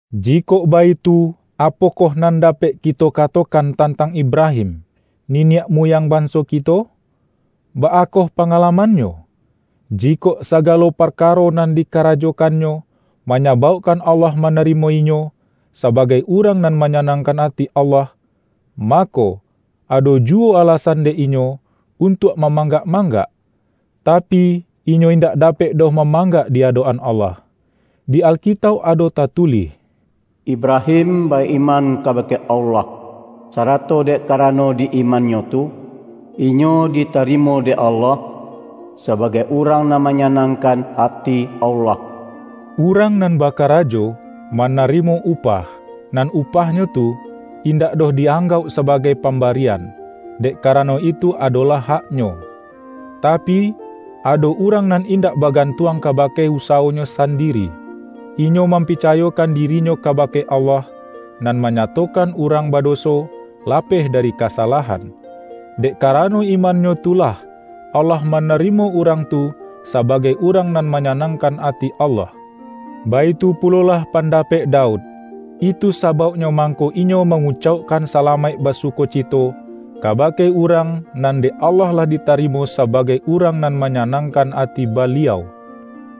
Jikok baitu, apokoh nan dapek kito katokan tantang Ibrahim, niniak muyang banso kito? Baa koh pangalamannyo? Jikok sagalo parkaro nan dikarajokannyo, manyabaukkan Allah manarimo inyo, sabagai urang nan manyanangkan ati Allah, mako, ado juwo alasan dek inyo, untuak mamanggak-manggak. Tapi, inyo indak dapek doh mamanggak di adok-an Allah. Di Alkitauk ado tatulih,”Ibrahim ba-iman kabake Allah, sarato dek karano di imannyo tu, inyo ditarimo dek Allah sabagai urang nan manyanangkan ati Allah.” Urang nan bakarajo, manarimo upah; nan upahnyo tu, indak doh di-anggauk sabagai pambarian, dek karano itu adolah haknyo. Tapi, ado urang nan indak bagantuang kabake usawonyo sandiri; inyo mampicayokan dirinyo kabake Allah, nan manyatokan urang badoso, lapeh dari kasalahan. Dek karano imannyo tu lah, Allah manarimo urang tu sabagai urang nan manyanangkan ati Allah. Baitu pulolah pandapek Daud; itu sabauknyo mangko inyo mangucaukkan salamaik basukocito, kabake urang nan dek Allah lah ditarimo sabagai urang nan manyanangkan ati Baliau,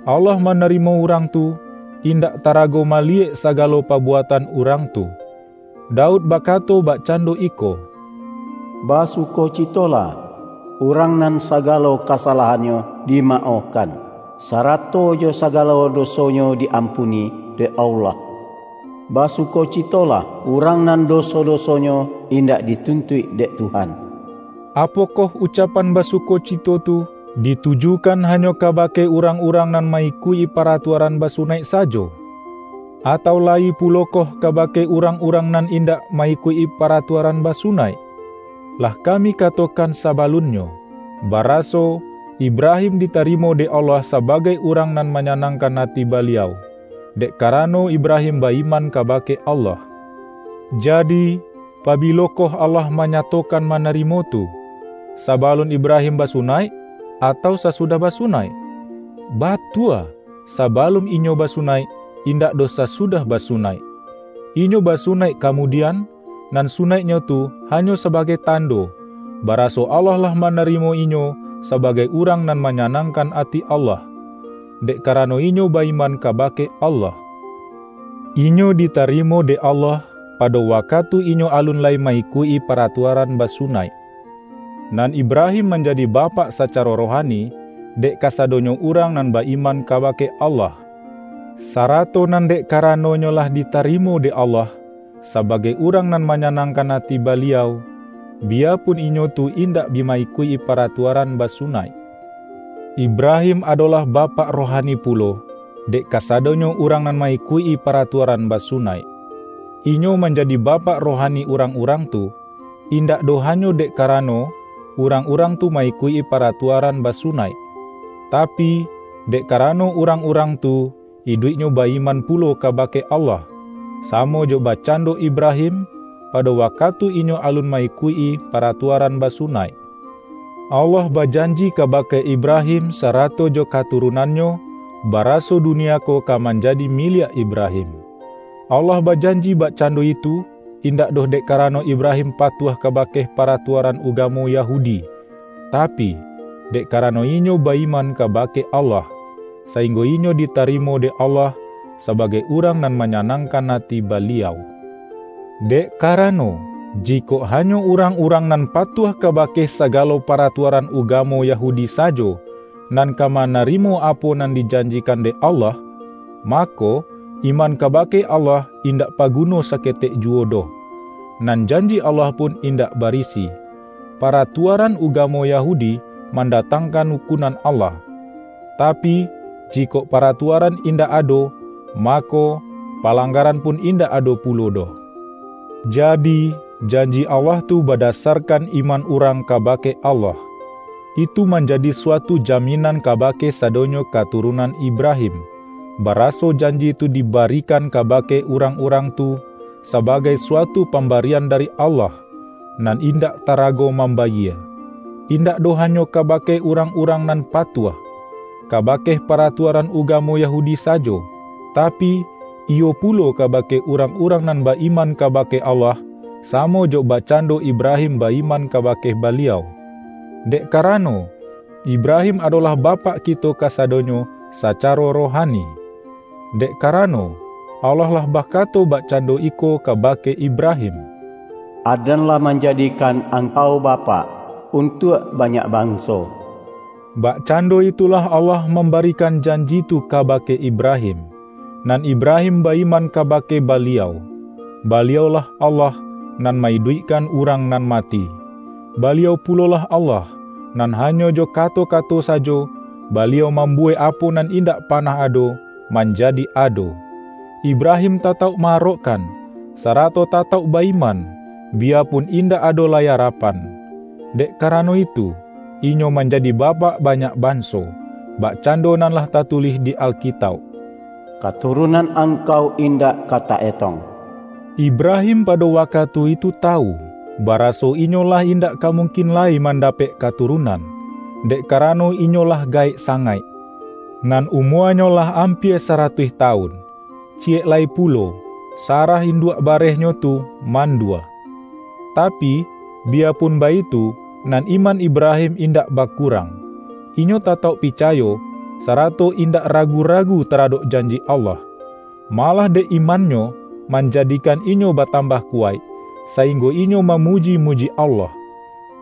Allah manarimo urang tu, indak tarago maliyek sagalo pabuatan urang tu. Daud bakato bakcando iko, ”Basukocitolah, urang nan sagalo kasalahannyo dimaohkan, sarato jo sagalo dosonyo di-ampuni dek Allah! Basukocitolah, urang nan doso-dosonyo indak dituntuik dek Tuhan!” Apokoh ucapan basukocito tu, ditujukan hanyo kabake urang-urang nan ma-ikuik-i paratuaran basunaik sajo? Atau layi pulokoh kabake urang-urang nan indak ma-ikuik-i paratuaran basunaik? Lah kami katokan sabalunnyo, baraso, Ibrahim ditarimo dek Allah sabagai urang nan manyanangkan ati Baliau, dek karano Ibrahim ba-iman kabake Allah. Jadi, pabilokoh Allah manyatokan manarimo tu? Sabalun Ibrahim basunaik, atau sasudah basunaik? Batua, sabalun inyo basunaik, indak doh sasudah basunaik. Inyo basunaik kamudian, nan sunaiknyo tu hanyo sabagai tando, baraso Allah lah manarimo inyo sabagai urang nan manyanangkan ati Allah, dek karano inyo ba-iman kabake Allah. Inyo ditarimo dek Allah, pado wakatu inyo alun lai ma-ikuik-i paratuaran basunaik. Nan Ibrahim manjadi bapak sacaro rohani, dek kasadonyo urang nan ba-iman kabake Allah, sarato nan dek karanonyo lah ditarimo dek Allah, sabagai urang nan manyanangkan ati Baliau, biyapun inyo tu indak bi ma-ikuik-i paratuaran basunaik. Ibrahim adolah bapak rohani pulo, dek kasadonyo urang nan ma-ikuik-i paratuaran basunaik. Inyo manjadi bapak rohani urang-urang tu, indak doh hanyo dek karano, urang-urang tu ma-ikuik-i paratuaran basunaik, tapi, dek karano urang-urang tu, iduiknyo ba-iman pulo kabake Allah, samo jo bakcando Ibrahim, pado wakatu inyo alun ma-ikuik-i paratuaran basunaik. Allah bajanji kabake Ibrahim sarato jo katurunannyo, baraso dunia ko ka manjadi miliak Ibrahim. Allah bajanji bakcando itu, indak doh dek karano Ibrahim patuah kabake paratuaran ugamo Yahudi, tapi, dek karano inyo ba-iman kabake Allah, sainggo inyo ditarimo dek Allah sabagai urang nan manyanangkan ati Baliau. Dek karano, jikok hanyo urang-urang nan patuah kabake sagalo paratuaran ugamo Yahudi sajo, nan ka manarimo apo nan dijanjikan dek Allah, mako, iman kabake Allah indak paguno saketek juwo doh, nan janji Allah pun indak barisi. Paratuaran ugamo Yahudi mandatangkan ukunan Allah. Tapi, jikok paratuaran indak ado, mako, palanggaran pun indak ado pulo doh. Jadi, janji Allah tu badasarkan iman urang kabake Allah. Itu manjadi suatu jaminan kabake sadonyo katurunan Ibrahim, baraso janji tu dibarikan kabake urang-urang tu, sabagai suatu pambarian dari Allah, nan indak tarago mambayie; indak doh hanyo kabake urang-urang nan patuah, kabake paratuaran ugamo Yahudi sajo, tapi, iyo pulo kabake urang-urang nan ba-iman kabake Allah, samo jo bakcando Ibrahim ba-iman kabake Baliau. Dek karano, Ibrahim adolah bapak kito kasadonyo sacaro rohani. Dek karano, Allah lah bakato bakcando iko kabake Ibrahim,”Aden lah manjadikan angkau bapak, untuak banyak banso.” Bakcando itulah Allah mambarikan janji tu kabake Ibrahim. Nan Ibrahim ba-iman kabake Baliau. Baliau-lah Allah, nan ma-iduikkan urang nan mati; Baliau pulolah Allah, nan hanyo jo kato-kato sajo, Baliau mambuwek apo nan indak panah ado, manjadi ado. Ibrahim tatauk ma-arokkan, sarato tatauk ba-iman, biyapun indak ado lai arapan. Dek karano itu, inyo manjadi bapak banyak banso. Bakcando nan lah tatulih di Alkitauk,”Katurunan angkau indak ka ta-etong.” Ibrahim pado wakatu itu tawu, baraso inyo lah indak ka mungkin lai mandapek katurunan, dek karano inyo lah gaek sangaik, nan umuanyo lah ampia saratuih tawun; ciyek lai pulo, Sarah induak barehnyo tu, mandua. Tapi, biyapun baitu, nan iman Ibrahim indak bakurang. Inyo tatauk picayo, sarato indak ragu-ragu taradok janji Allah. Malah dek imannyo, manjadikan inyo batambah kuwaik, sainggo inyo mamuji-muji Allah.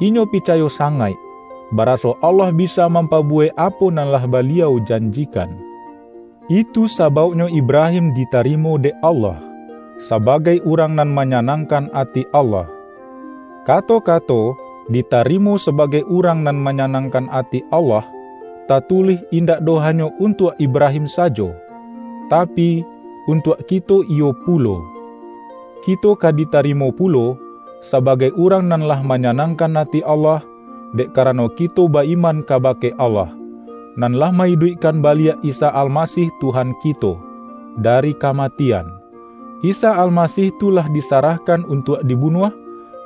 Inyo picayo sangaik, baraso Allah bisa mampabuwek apo nan lah Baliau janjikan. Itu sabauknyo Ibrahim ditarimo dek Allah, sabagai urang nan manyanangkan ati Allah. Kato-kato”ditarimo sabagai urang nan manyanangkan ati Allah,” tatulih indak doh hanyo untuak Ibrahim sajo, tapi, untuak kito iyo pulo. Kito ka ditarimo pulo, sabagai urang nan lah manyanangkan ati Allah, dek karano kito ba-iman kabake Allah, nan lah ma-iduikkan baliak Isa Almasih Tuhan kito, dari kamatian. Isa Almasih tu lah disarahkan untuak dibunuah,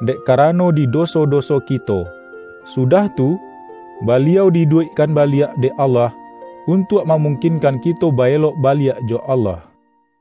dek karano di doso-doso kito; sudah tu, Baliau di-iduikkan baliak dek Allah, untuak mamungkinkan kito ba-elok baliak jo Allah. ROMA